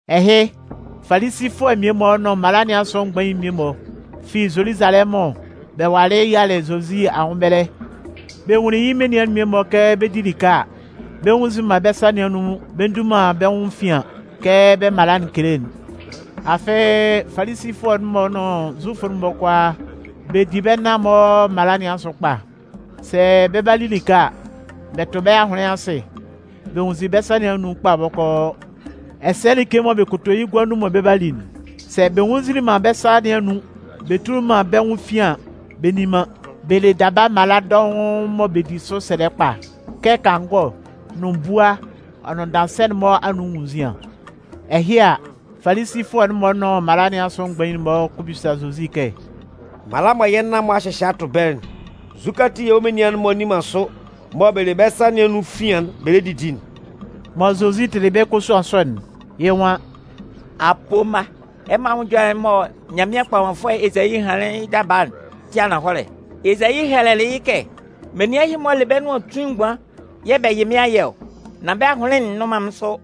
Ɛhɩ, Falisifʋɛ mmie-mɔ nʋn mala nɩn asʋ mgbain mmie-mɔ fi Zoluzalɛmʋn bɛ walɩ yialɩ Zozi anwʋn ɛbɛlɛ. Bɛ nwunlin yɩ́ menian'n mmie-mɔ kɛ bɛ 'di like a, bɛ nnwunnzin man bɛ́ sa nɩn anun bɛ ndu man bɛ́ nwʋn efian kɛ bɛ́ mala'n kele'n. Afɩ, Falisifʋɛ'n-mɔ nʋn Zufʋ'n-mɔ kʋalaa, bɛ di bɛ́ nan-mɔ mala sɔ nɩn asʋ kpa. Sɛ bɛ 'ba li like a, bɛ tʋ bɛ́ ahʋnlɩn asɩ bɛ nwunnzin bɛ́ sa nɩn anun kpa bɔkɔɔ. Ɛsɛ like mɔ bɛ kɔ to yɩ́ gua nun mɔ bɛ 'ba li'n, sɛ bɛ nwunnzinlin man bɛ́ sa nɩn anun bɛ tuli man bɛ́ nwʋn efian an, bɛ nni man. Bɛ le daba mala dɔʋn mɔ bɛ di sʋ sɛlɛ kpa kɛ kangɔ nʋn bua ɔ nʋn daansɛ'n-mɔ anun enwunnzian. Ɛhɩ a, Falisifʋɛ'n-mɔ nʋn mala nɩn asʋ mgbain'n-mɔ kɔ bisa Zozi kɛ: “Mala mɔ yɛ́ nan-mɔ a hyɩhyɛ a tʋ ɛbɛlɛ'n, nzukɛ ati yɛ̂ wɔ́ menian'n-mɔ nni man sʋ mɔ bɛ le bɛ́ sa nɩn anun efian'n bɛ lɛ didi'n?” Mɔ Zozi tɩlɩ bɛ́ kosuan sɔ'n, yɩ́ nwan: “Apoo mma, ɛmɔ anwʋn ɛjɔlɛ'n mɔ Nyanmɩan kpɔmanfʋɛ Ezayi hanlɩn yɩ́ daba'n tɩ ananhɔlɛ. Ezayi hɛlɛlɩ yɩ́ kɛ: Menian ɛhɩ-mɔ le bɛ́ nʋan tuin mgban yɛ̂ bɛ yɩ mɩ́n ayɛ ɔ, nan bɛ́ ahʋnlɩn'n nnʋn man mɩ́n sʋ.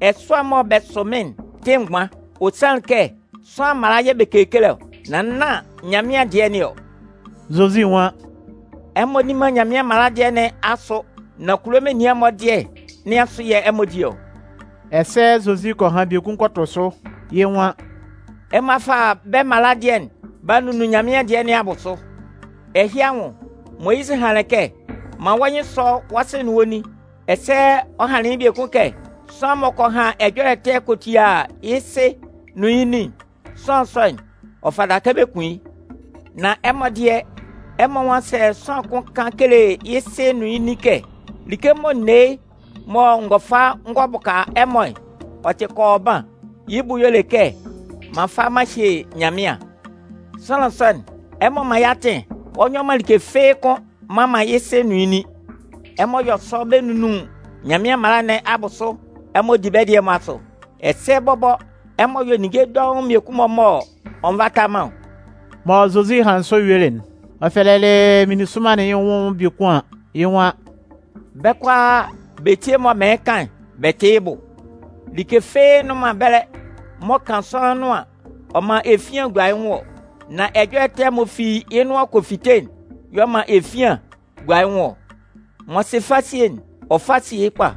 Ɛsʋɛ'n mɔ bɛ sʋ mɩ́n'n tɩ mgban. Ɔ sanlɩn kɛ kulo sʋanlan mala yɛ̂ bɛ kekele ɔ, nan nán Nyanmɩan dɩɛ nɩn ɔ.” Zozi nwan: “Ɛmɔ nni man Nyanmɩan mala dɩɛ nɩn asʋ nan kulo menian'n-mɔ dɩɛ nɩn asʋ yɛ̂ ɛmɔ di ɔ.” Ɛsɛ Zozi kɔ han biekun kɔ tʋ sʋ. Yɩ́ nwan: “Ɛmɔ a fa bɛ́ mala dɩɛ'n b'a nunnun Nyanmɩan dɩɛ nɩn abʋsʋ. Ɛhɩ anwʋn, Moyizɩ hanlɩn kɛ: Man wɔ́ nyɩn sɔ́ wɔ́ sɩ nʋn wɔ́ nin. Ɛsɛ ɔ hanlɩn yɩ́ biekun kɛ: Sʋanlan m'ɔ kɔ han ɛjɔlɛ ɛtɛ kɔ tia yɩ́ sɩ nʋn yɩ́ nin'n, sʋanlan sɔ'n, ɔ fata kɛ bɛ kun yɩ́. Nan ɛmɔ dɩɛ, ɛmɔ nwan sɛ sʋanlan kʋn kan kele yɩ́ sɩ nʋn yɩ́ nin kɛ: ‘Like mɔ n ne yɩ́ mɔ n gɔ fa n gɔ bʋka ɛmɔ'n, ɔ tɩ kɔɔban’ (yɩ́ bʋ y'ɔ le kɛ m'an fa m'an hye Nyanmɩan), sʋanlan sɔ'n, ɛmɔ mman man yɩ́ atɩn ɔ nyɔ man like fɩ́ɩ́ kʋ́n mman man yɩ́ sɩ nʋn yɩ́ nin. Ɛmɔ yɔ sɔ bɛ nunnun Nyanmɩan mala nɩn abʋsʋ ɛmɔ di bɛ́ dɩɛ'n-mɔ asʋ. Ɛsɛ bɔbɔ ɛmɔ yɔ ninnge dɔʋn mmiekun-mɔ m'ɔ nvata man ɔ.” Mɔ Zozi hanlɩn sɔ yuelɩ'n, ɔ fɛlɛlɩ meninsʋnman'n yɩ́ nwʋn biekun an, yɩ́ nwan: “Bɛ́ kʋalaa bɛ tíe mɔ mɩɩn kan'n bɛ tɩ́ yɩ́ bʋ. Like fɩ́ɩ́ nnʋn man ɛbɛlɛ m'ɔ kan sʋanlan nʋan, ɔ man efian gua yɩ́ nwʋn ɔ. Nan ɛjɔlɛ ɛtɛ m'ɔ fi yɩ́ nʋan kɔ fite'n yɛ̂ ɔ man efian gua yɩ́ nwʋn ɔ. [ M'ɔ sɩ fasie'n, ɔ fá síe kpa!”]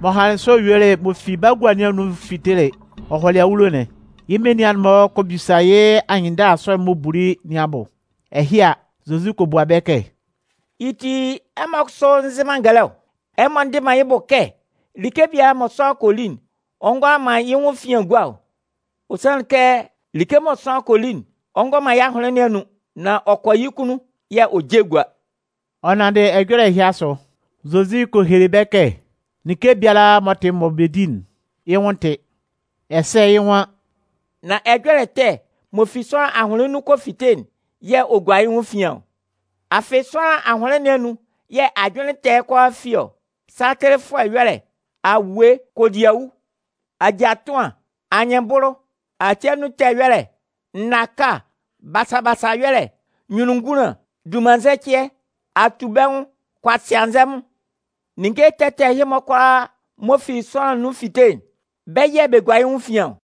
M'ɔ hanlɩn sɔ yuelɩ m'ɔ fi bagua nɩn anun ɔ fitelɩ ɔ hɔlɩ awulo'n, yɩ́ menian'n-mɔ kɔ bisa yɩ́ anyɩnndala sɔ'n m'ɔ buli nɩn abʋ. Ɛhɩ a, Zozi kɔ bua bɛ kɛ: “Yɩ́ ti, ɛmɔ kʋsʋ nzɩ man ngɛlɛ ɔ? Ɛmɔ ndɩ man yɩ́ bʋ kɛ like biala mɔ sʋanlan kɔ li'n, ɔ ngʋala man yɩ́ nwʋn efian gua ɔ? Ɔ sanlɩn kɛ like mɔ sʋanlan kɔ li'n, ɔ ngɔ man yɩ́ ahʋnlɩn nɩn anun. Nan ɔ kɔ yɩ́ kunnun yɛ̂ ɔ je gua.” (Ɔ nanndɩ ɛjɔlɛ ɛhɩ asʋ, Zozi kɔ hele bɛ́ kɛ like biala m'ɔ tɩ mɔ bɛ di'n, yɩ́ nwʋn tɩ.) Ɛsɛ yɩ́ nwan: “Nan ɛjɔlɛ ɛtɛ m'ɔ fi sʋanlan ahʋnlɩn nun kɔ fite'n yɛ̂ ɔ gua yɩ́ nwʋn efian ɔ. Afɩ sʋanlan ahʋnlɩn nɩn anun yɛ̂ ajʋnlɩn ɛtɛ'n kʋalaa fi ɔ: satɩlɩfʋɛ ɛyɔlɛ, awue, kodiawu, ajaa ɛtʋan, anyɩnbʋlʋ, ati anun ɛtɛ ɛyɔlɛ, nnaka, basa-basa ɛyɔlɛ, nyunnunngunlan, dunmannzɛcɩɛ, atubɛnwʋn, kʋasɩanzɛmʋn. Ninnge ɛtɛ ɛtɛ ɛhɩ-mɔ kʋalaa m'ɔ fi sʋanlan nun fite'n, bɛ́ yɛ̂ bɛ gua yɩ́ nwʋn efian ɔ.”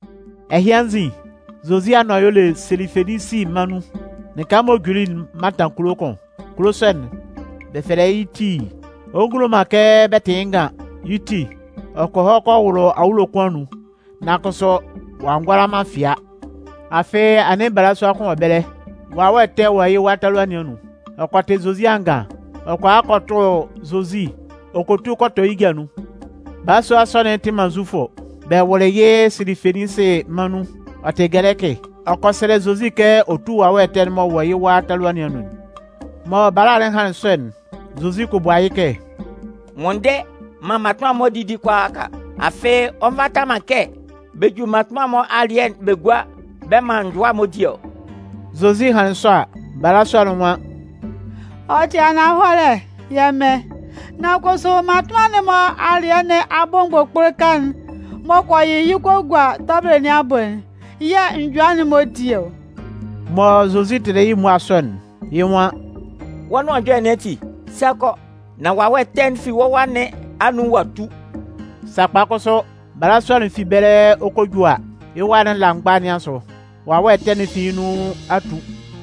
Ɛhɩ anzin, Zozi anʋan y'ɔ le Silifeninsi mân nun. Lɩka m'ɔ juli'n mantan kulo kʋn. Kulo sɔ'n, bɛ fɛlɛ yɩ́ Tii. Ɔ ngulo man kɛ bɛ tɩ yɩ́ ngan. Yɩ́ ti, ɔ kɔ hɔ kɔ wʋlʋ awulo kʋn anun. Nan kʋsʋ ɔ'a ngʋala man fɩa. Afɩ anɩn balasua kʋn wɔ ɛbɛlɛ, wawɛ ɛtɛ wɔ yɩ́ wa talua nɩn anun. Ɔ kɔ tɩ Zozi angan. Ɔ kɔ a kɔ tʋ Zozi ɔ kɔ tu kɔ tɔ yɩ́ ja nun. Balasua sɔ'n tɩ man Zufʋ. Bɛ wʋlɩ yɩ́ Silifeninsi mân nun. Ɔ tɩ gɛlɛkɩ. Ɔ kɔ sɛlɛ Zozi kɛ ɔ tú wawɛ ɛtɛ'n m'ɔ wɔ yɩ́ wa talua nɩn anun'n. Mɔ bala'n hanlɩn sɔ'n, Zozi kɔ bua yɩ́ kɛ: “Nwʋnndɛ maan mmatʋnman'n-mɔ didi kʋalaaka. Afɩ, ɔ nvata man kɛ bɛ ju mmatʋnman'n-mɔ alɩɛ'n bɛ gua bɛ man njʋa'n-mɔ di ɔ.” Zozi hanlɩn sɔ a, balasua'n nwan: “Ɔ tɩ ananhɔlɛ, yɛ́ Mɩn. Nan kʋsʋ mmatʋnman'n-mɔ alɩɛ nɩn abʋ mgbʋkpʋlʋka'n m'ɔ kɔ yɩyɩ kɔ gua tɔbɩlɩ nɩn abʋ'n yɛ̂ njʋa'n-mɔ di ɔ.” Mɔ Zozi tɩlɩ yɩ́ mmua sɔ'n, yɩ́ nwan: “Wɔ́ nʋan ɛjɔlɛ nɩn ati, sa kɔ, nan wawɛ ɛtɛ'n fi wɔ́ wa nɩn anun ɔ'a tu.” Sakpa kʋsʋ, balasua'n fi ɛbɛlɛ ɔ 'kɔ a ju a, yɩ́ wa'n la mgba nɩn asʋ, wawɛ ɛtɛ'n fi yɩ́ nun a tu.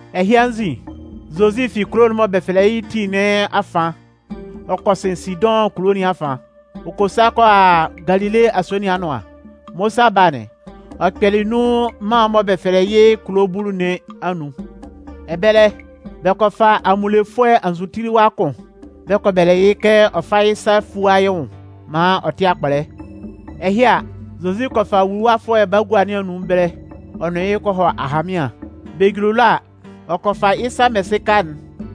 Ɛhɩ anzin, Zozi fi kulo'n mɔ bɛ fɛlɛ yɩ́ Tii nɩn afan ɔ kɔ sɩn Sidʋn kulo nɩn afan, ɔ kɔ sa kɔ a Galile asue nɩn anʋan. Mɔ ɔ 'sa ba'n, ɔ kpɛlɩ nun mân'n mɔ bɛ fɛlɛ yɩ́ Kulo Bulu nɩn anun. Ɛbɛlɛ, bɛ kɔ fa amunlefʋɛ anzʋtiliwa kʋn bɛ kɔ bɛlɛ yɩ́ kɛ ɔ fá yɩ́ sa fúa yɩ́ nwʋn maan ɔ tɩ́ akpɔlɛ. Ɛhɩ a, Zozi kɔ fa wuluwafʋɛ'n bagua nɩn anun ɛbɛlɛ, ɔ nʋn yɩ́ kɔ hɔ ahanmɩan. Bɛ juli ɛlɔ a, ɔ kɔ fa yɩ́ sa mɛsɩka'n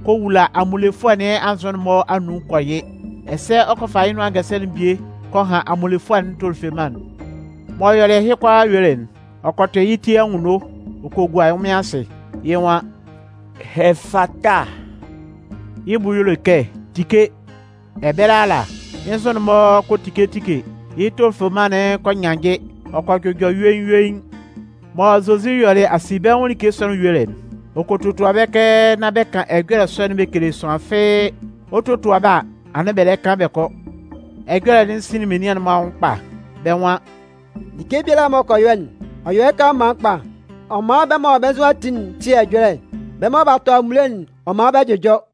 kɔ wula amunlefʋɛ nɩn anzʋ'n-mɔ anun kɔ yɩ. Ɛsɛ ɔ kɔ fa yɩ́ nʋan ngɛsɛlɛ'n bie kɔ han amunlefʋɛ'n tofeleman'n. M'ɔ yɔlɩ ɛhɩ kʋalaa yuelɩ'n, ɔ kɔ tʋ yɩ́ ti anwunno ɔ kɔ gua ɛnwʋnmɩan asɩ. Yɩ́ nwan: “Ɛfata!” Yɩ́ bʋ y'ɔ le kɛ tike! Ɛbɛlɛ ala, yɩ́ nzʋ'n-mɔ kɔ tike tike, yɩ́ tofeleman'n kɔ nyannjɩ, ɔ kɔ jʋjɔ yuein-yuein. Mɔ Zozi yɔlɩ asinbɛnwʋn like sɔ'n yuelɩ'n, ɔ kɔ totua bɛ́ kɛ nán bɛ kan ɛjɔlɛ sɔ'n bɛ kele sʋanlan fɩ́ɩ́. Ɔ 'totua bɛ́ a, anɩn bɛ lɛ kan bɛ kɔ. Ɛjɔlɛ'n sinlin menian'n-mɔ anwʋn kpa. Bɛ́ nwan: “Like biala m'ɔ kɔ yɔ'n, ɔ yɔ yɩ́ kanlanman kpa! Ɔ man bɛ́ mɔ bɛ́ nzʋ a ti'n tɩ ɛjɔlɛ! Bɛ́ mɔ b'a tɔ amunle'n, ɔ man bɛ jʋjɔ!”